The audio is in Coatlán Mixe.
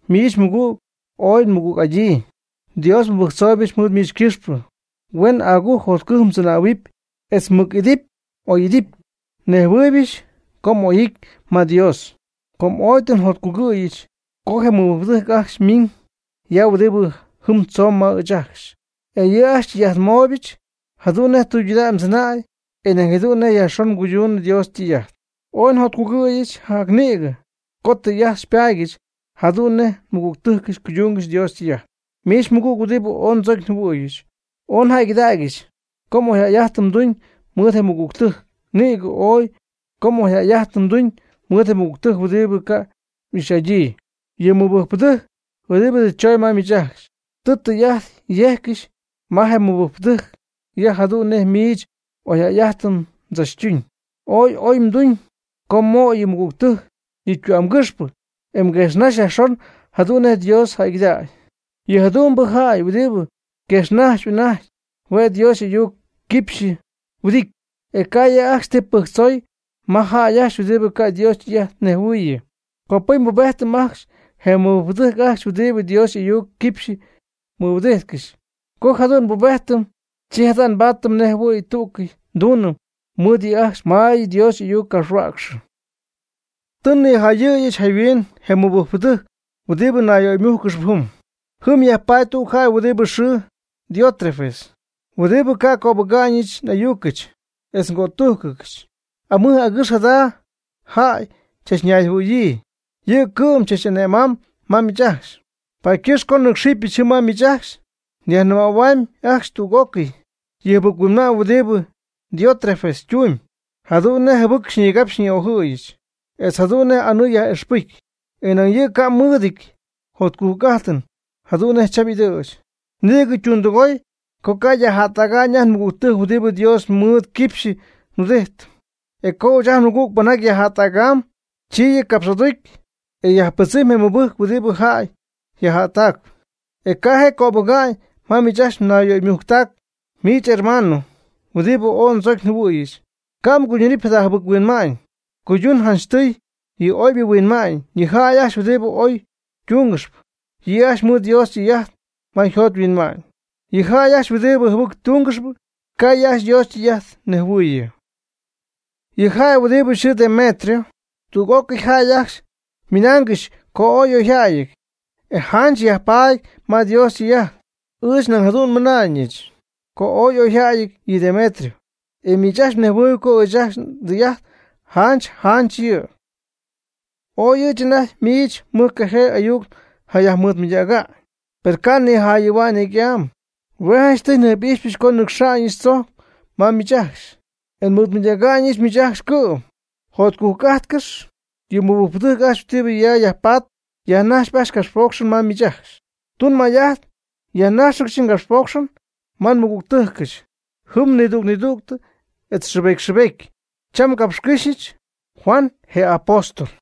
Miich mɨgüg, ooy nmɨgüg'adyii. Dios nmɨbɨjctzooybɨch mɨɨd miich ycɨxpɨ, huen agujc jotcujc mdzɨnähuɨpy etz mmɨc'idɨpy m'oy'idɨpy. Nejhuɨɨybɨch co oy m'ity ma Dios. Com oy tɨ njotcugɨ̈yɨch co je mɨbɨjcpɨdɨjc ajcxy ymiiñ ya huɨdibɨ jɨm tzoon ma miich ajcxy, e yɨ' ajcxy xytɨy'ajtmooyɨch jadu'n nej tɨydudägy mdzɨnäy e nañ jadu'n nej yajxon mguydunɨ Dios ytɨy'ajt. Ooy njotcújcɨdyɨch jac nïgɨ co tɨy'ajt nbaadyɨch jadu'n nej nmɨgügtɨjcɨch cuydungɨxy Dios ytɨy'ajt. Miich mɨgüg huɨdibɨ ooy ndzocy njɨhuɨ̈yɨch, ooy njäygɨdägyɨch co oyjäy'ajtɨn mduñ mɨɨd je mɨgügtɨjc. Nïgɨ oy co oyjäy'ajtɨn mduñ mɨɨd je mɨgügtɨjc huɨdibɨ ca' m'ixy'adyii. Yɨ mɨbɨjcpɨdɨjc, huɨdibɨ tɨ chooñ ma miich ajcxy, tɨ tɨy'ajt yejccɨxy ma je mɨbɨjcpɨdɨjc ya jadu'n nej miich oyjäy'ajtɨn mdzachtuñ. Ooy oy mduñ co mmöy yɨ mɨgügtɨjc yɨ ytü'amgɨxpɨ e mguejxnaxy yajxon jadu'n nej Dios jäygɨdägy. Yɨ jadu'mbɨ jäy huɨdibɨ mguejxnajxyp anajty hue' Dios y'ayuc ycɨxpɨ yhuɨdity, e ca' yɨ' ajcxy ti pɨjctzoy ma je jäy ajcxy huɨdibɨ ca' Dios ytɨy'ajt nejhuɨɨyɨ. Copɨcy nbubejtɨm ajcxy je mɨbɨjcpɨdɨjc ajcxy huɨdibɨ Dios y'ayuc ycɨxpɨ yhuɨdijtcɨxy. Co jadu'n nbubejtɨm, chi jadu'n paady nej jɨhuɨ̈y tú'cɨy nduunɨm mɨɨd yɨ' ajcxy ma Dios y'ayuc capxhuäcxɨɨ. Tɨ nnijayɨ̈yɨch jayhuin je mɨbɨjcpɨdɨjc huɨdibɨ nayyöymújcɨgɨxp jɨm. Jɨm yajpaady tüg jäy huɨdi xɨɨ Diótrefes huɨdibɨ ca' cöbɨga'ñɨch n'ayucɨch etz ngötújcɨnɨch. Amɨj agɨx jada jäy chachñayjɨhuɨ̈yii, yɨ' cɨ'm tzach'ane'mam ma miich ajcxy. Paady ycɨxp co nnɨ́cxɨbɨch jɨm ma miich ajcxy nyajnɨmähuamy ajcxy tüg'ócɨy yɨ jɨbɨc-huinma'ñ huɨdibɨ Diótrefes ytumyb, jadu'n nej jɨbɨc xyñigapxy xyñi'ojɨ̈yɨch etz jadu'n nej anɨɨ yaj'ixpɨcy. E nañ ni yɨ' ca' mmɨɨdɨty jotcujc'ajtɨn jadu'n nej chach'ɨdɨ̈ch. Nïgɨ ytundɨgoy co ca' yajjättäga'ñ ajt nmɨgügtɨjc huɨdibɨ Dios mɨɨd ycɨxpɨ yhuɨdity. E co ɨɨch ajt nmɨgüg pɨnjaty yajjättäga'ñ, chi yɨ' capx'aducy e yajpɨdzɨmy je mɨbɨjcp huɨdibɨ jäy yajjättäc, e ca' je' cöbɨga'ñ ma miich mnayyöymujctac. Miich hermano, huɨdibɨ ooy ndzocy njɨhuɨ̈yɨch, ca' mguydunɨpy jada jɨbɨc-huinma'ñ. Cuydun janchtɨy yɨ oybɨ huinma'ñ. Yɨ jäy ajcxy huɨdibɨ oybɨ tungɨxp, yɨ' ajcxy ymɨɨd Dios ytɨy'ajt ma yjot yhuinma'ñ. Yɨ jäy ajcxy huɨdibɨ jɨbɨc tungɨxp, ca' yɨ' ajcxy Dios ytɨy'ajt nejhuɨɨyɨ. Yɨ jäy, huɨdibɨ yxɨɨ Demetrio, tüg'ócɨy jäy ajcxy ymɨnaangɨxy co ooy y'oyjäyɨty, e janch yajpaady ma Dios ytɨy'ajt. Ɨɨch nañ jadu'n nmɨna'ñɨch co ooy y'oyjäyɨty yɨ Demetrio, e miich mnejhuɨɨyb co ɨɨch ajt ndɨy'ajt janch janch yɨ'. Ooy ɨɨch anajty miich mɨjcajee ayuc njayajmɨɨdmɨydäga'ñ. Per ca' nijayɨ̈hua'ñ necy'am. Hue' janchtɨy njɨjp'ixyɨch co nnɨcxa'ñɨch tzojc ma miich ajcxy, e nmɨɨdmɨydäga'ñɨch miich ajcxy cɨ'm. Jotcujc'ájtcɨx. Yɨ mɨbɨjcpɨdɨjc ajcxy huɨdibɨ ya yajpatp yajnajxpy ajcxy capxpocxɨn ma miich ajcxy. Tun may'ajt yajnájxɨgɨch ngapxpocxɨn ma nmɨgügtɨjcɨch jɨm nidüg nidüg etz xɨɨbety xɨɨbety. Cham ngapxycɨ́xyɨch, Juan je Apóstol.